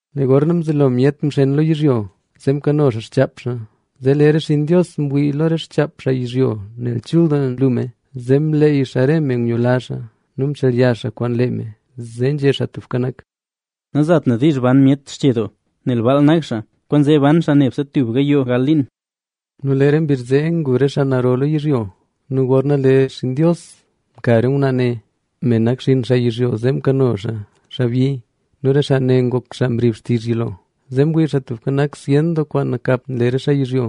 Lee gorna mzelo myet myar lo yizhyo, zee mkano xaa xchaap xaa. Zee lee re xinn Dios mwii lo re xchaap xaa yizhyo nel chul doo nlu me, zee mleey xaa re me ngula xaa nu mchelya xaa kwaan lee me. Zee nzhé Xaa Tubka Nak: “Nazat na diizh ban myet xche doo, nel baal nak xaa, kwaanzee ban xaa nebse tub gayoo gal liin”. Nu lee re mbizh zee ngu re xaa naro lo yizhyo. Nu gorna lee xinn Dios mka re ngwnaa ne, me nak xinn xaa yizhyo, zee mkano xaa xaabyi. Nu re xaa ne ngok xaa mrib xtizh yilo. Zee mwii Xaa Tubka Nak zyen doo kwaan nakap nle re xaa yizhyo,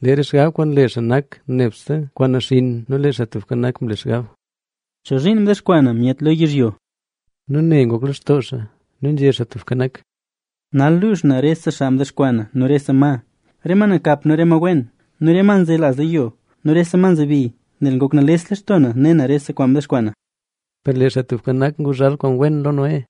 nle xaa xgab kwaan nle xaa nak nebse kwaan naxinn. Nu lee Xaa Tubka Nak mle xgab: “¿Chozhiin mdexkwaa na myet lo yizhyo?” Nu ne ngok lextoo xaa. Nu nzhé Xaa Tubka Nak: “Nal luux na rese xaa mdexkwaa na nu rese ma, re ma nakap nu re ma wen nu re ma nzelaz lo yo nu re ma nzebi, nel ngok nales lextoo na ne na rese kwaan mdexkwaa na”. Per lee Xaa Tubka Nak nguzhal kwaan wen lo Noé.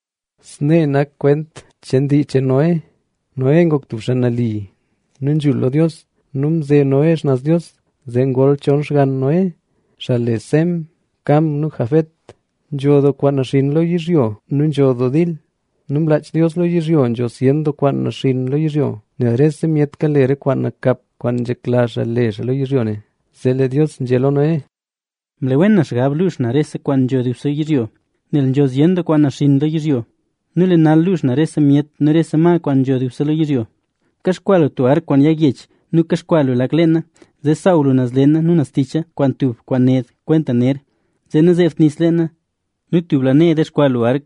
Snee nak kwent cheen dii cheen Noé. Noé ngok tub xaa nali nu wen lo Dios nu mze Noé xnaz Dios. Zee ngol chon xgann Noé, xaa le Sem, Cam nu Jafet. Nzho doo kwaan naxinn lo yizhyo nu nzho doo dil. Nu mlaach Dios lo yizhyo, nzho zyen doo kwaan naxinn lo yizhyo, nel rese myet kale re kwaan nakap kwaan nzhekla xaa le xaa lo yizhyo ne. Zee nzhé Dios lo Noé: —Mle wen na xgab luux na rese kwaan nzho dubse yizhyo, nel nzho zyen doo kwaan naxinn lo yizhyo. Nu lee nal luux na rese myet nu rese ma kwaan nzho dubse lo yizhyo. Kaxkwaa lu tub ark kwaan yag yech nu kaxkwaa lu lak leena, zee saaw lu naz leena nu naz ticha kwaan tub kwaan ned kwenta ner, zee nazeebt nis leena. Nu tub lanee dexkwaa lu ark,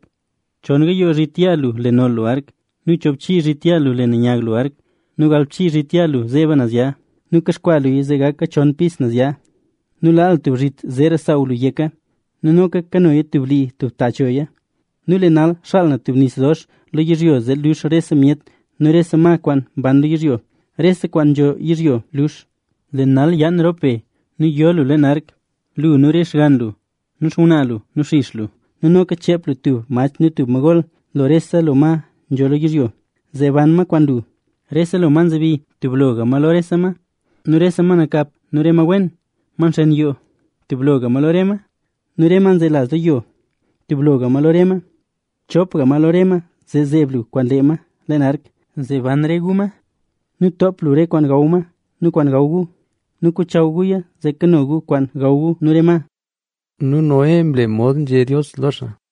chon gayoo zhit yaa lu le noll lu ark nu choobchii zhit yaa lu le nanyag lu ark nu galbchii zhit yaa lu zeeba naz ya. Nu kaxkwaa luya zee gaka chon pis naz ya. Nu laa lu tub zhit zeera saaw lu yeka. Nu noka kanoya tub blii tub ta choya. Nu lee nal, xaal na tub nis dox lo yizhyo zee luux rese myet nu rese ma kwaan mban lo yizhyo, rese kwaan nzho yizhyo. Lee nal yaan rop be nu yo lu leen ark: lu nu re xgann lu nu xngwnaa lu nu xix lu. Nu noka cheep lu tub mach nu tub ma gol lo rese lo ma nzho lo yizhyo, zee ban ma kwaan lu. Rese lo ma nzebi, tub loga ma lo rese ma nu rese ma nakap nu rese ma wen, ma nxen yoo, tub loga ma lo rese ma. Nu re ma nzelaz lo yo, tub loga ma lo re ma. Chopga ma lo re ma zee zeeb lu kwaan lee ma leen ark, zee ban re gu ma. Nu toop lu rese lo kwaan gaw ma nu kwaan gaw re gu nu kochaw guya zee kano gu kwaan gaw gu nu re ma. Nu Noé mle mod nzhé Dios lo xaa.